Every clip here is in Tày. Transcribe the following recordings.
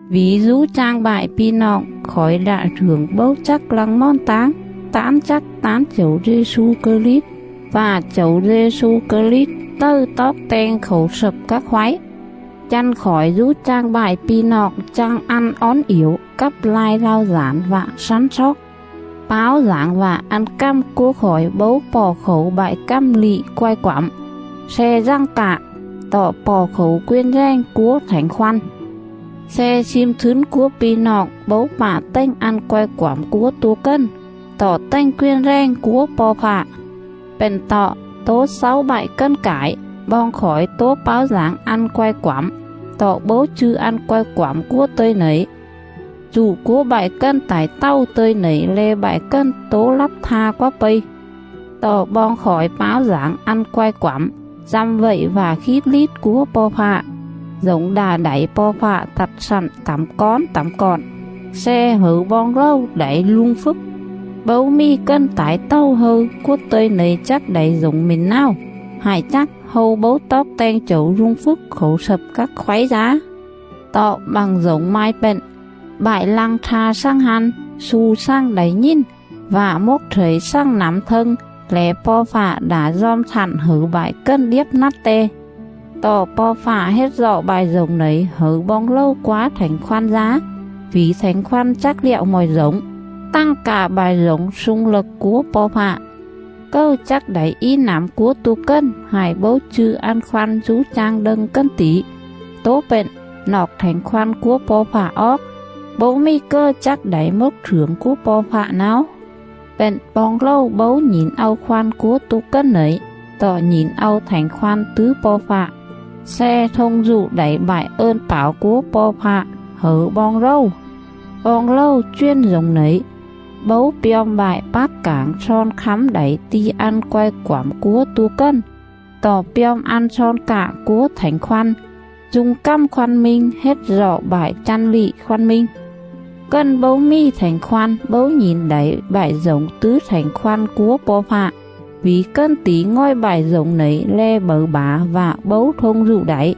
Vỉ dú chang bại pi̱ noọng, khỏi đạ slưởng bấu chắc lăng mòn táng tán chắc tán Chẩu Dê-xu Krit, vạ Chẩu Dê-xu Krit tầư toóc teng khảu slập các khoáy. Chăn khỏi dú chang bại pi̱ noọng chang ăn ón iểu, cắp lai lao dản vạ slắn sloóc.. Páo dảng vạ ăn cằm cúa khỏi bấu pọ khảu bại cằm lị quai quẳm sle dằng cạ, tọ pọ khảu quền rèng cúa Thảnh Khoăn; sle slim slứn cúa pi̱ noọng bấu pạ tềnh ăn quai quẳm cúa tua cần, tọ tềnh quền rèng cúa Po̱ Fạ. Pện tọ, tó xáu bại cần cải, boong khỏi tố páo dảng ăn quai quẳm, tọ bấu chư̱ ăn quai quẳm cúa tơ̱i nẩy, rụ cúa bại cần tải tầu tơ̱i nẩy le̱ bại cần tố lắp tha quá pây. Tọ boong khỏi páo dảng ăn quai quẳm, dăm vậy vạ khít lít cúa Po̱ Fạ, dổng đạ đảy Po̱ Fạ tặt slặn tẳm cón tẳm cọn, sle hẩư boong rầu đảy rung phjức. Bấu mì cần tải tầu hâư cúa tơ̱i nẩy chắc đảy dổng mỉn náo, hại chắc, hâu bấu toóc teng Chẩu rung phjức khảu slập các khoáy dá. Tọ, bặng dổng mai pện: “Bại lăng tha xằng hăn, xu xằng đảy nhìn, Vạ mốc slẩy xằng nẳm thâng Lẻ Po̱ Fạ đạ dom slặn hẩư bại cần điếp nắt Te.”. Tọ Po̱ Fạ hết rọ bại dổng nẩy hẩư boong rầu quá Thảnh Khoăn dá. Vỉ Thảnh Khoăn chắc lẹo mọi dổng, tằng cạ bại dổng slung lậc cúa Po̱ Fạ. Cầư chắc đảy í nẳm cúa tua cần, hại bấu chư̱ ăn khoăn dú chang đâng cần tỉ? Tố pện, noọc Thảnh Khoăn cúa Po̱ Fạ oóc, bấu mì cầư chắc đảy mốc slưởng cúa Po̱ Fạ náo. Pện, boong rầu bấu nhỉn au khoăn cúa tua cần nẩy, tọ nhỉn au Thảnh Khoăn tứ Po̱ Fạ, sle thông rụ đảy bại ơn pảo cúa Po̱ Fạ hẩư boong rầu. Boong rầu chuyền dổng nẩy, bấu pjom bại pác cảng slon khắm đảy ti̱ ăn quai quẳm cúa tua cần, tọ pjom ăn slon cạ cúa Thảnh Khoăn, du̱ng cằm khoăn minh hết rọ bại chăn lị khoăn minh. Cần bấu mì Thảnh Khoăn bấu nhỉn đảy bại dổng tứ Thảnh Khoăn cúa Po̱ Fạ, vỉ cần tỉ ngòi bại dổng nẩy le̱ bẩư bả vạ bấu thông rụ đảy,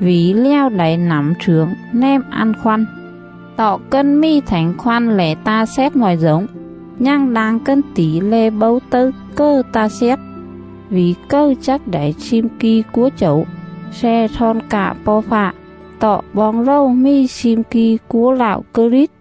vỉ lèo đảy nẳm slưởng nèm ăn khoăn. Tọ, cần mì Thảnh Khoăn lẻ ta xét mọi dổng, nhằng đang cần tỉ lẻ bấu tầư cầư ta xét. “Vỉ cầư chắc đảy slim ki cúa Chẩu, Sle slon cạ Po̱ Fạ?”. Tọ boong rầu mì slim ki cúa Lạo Krit.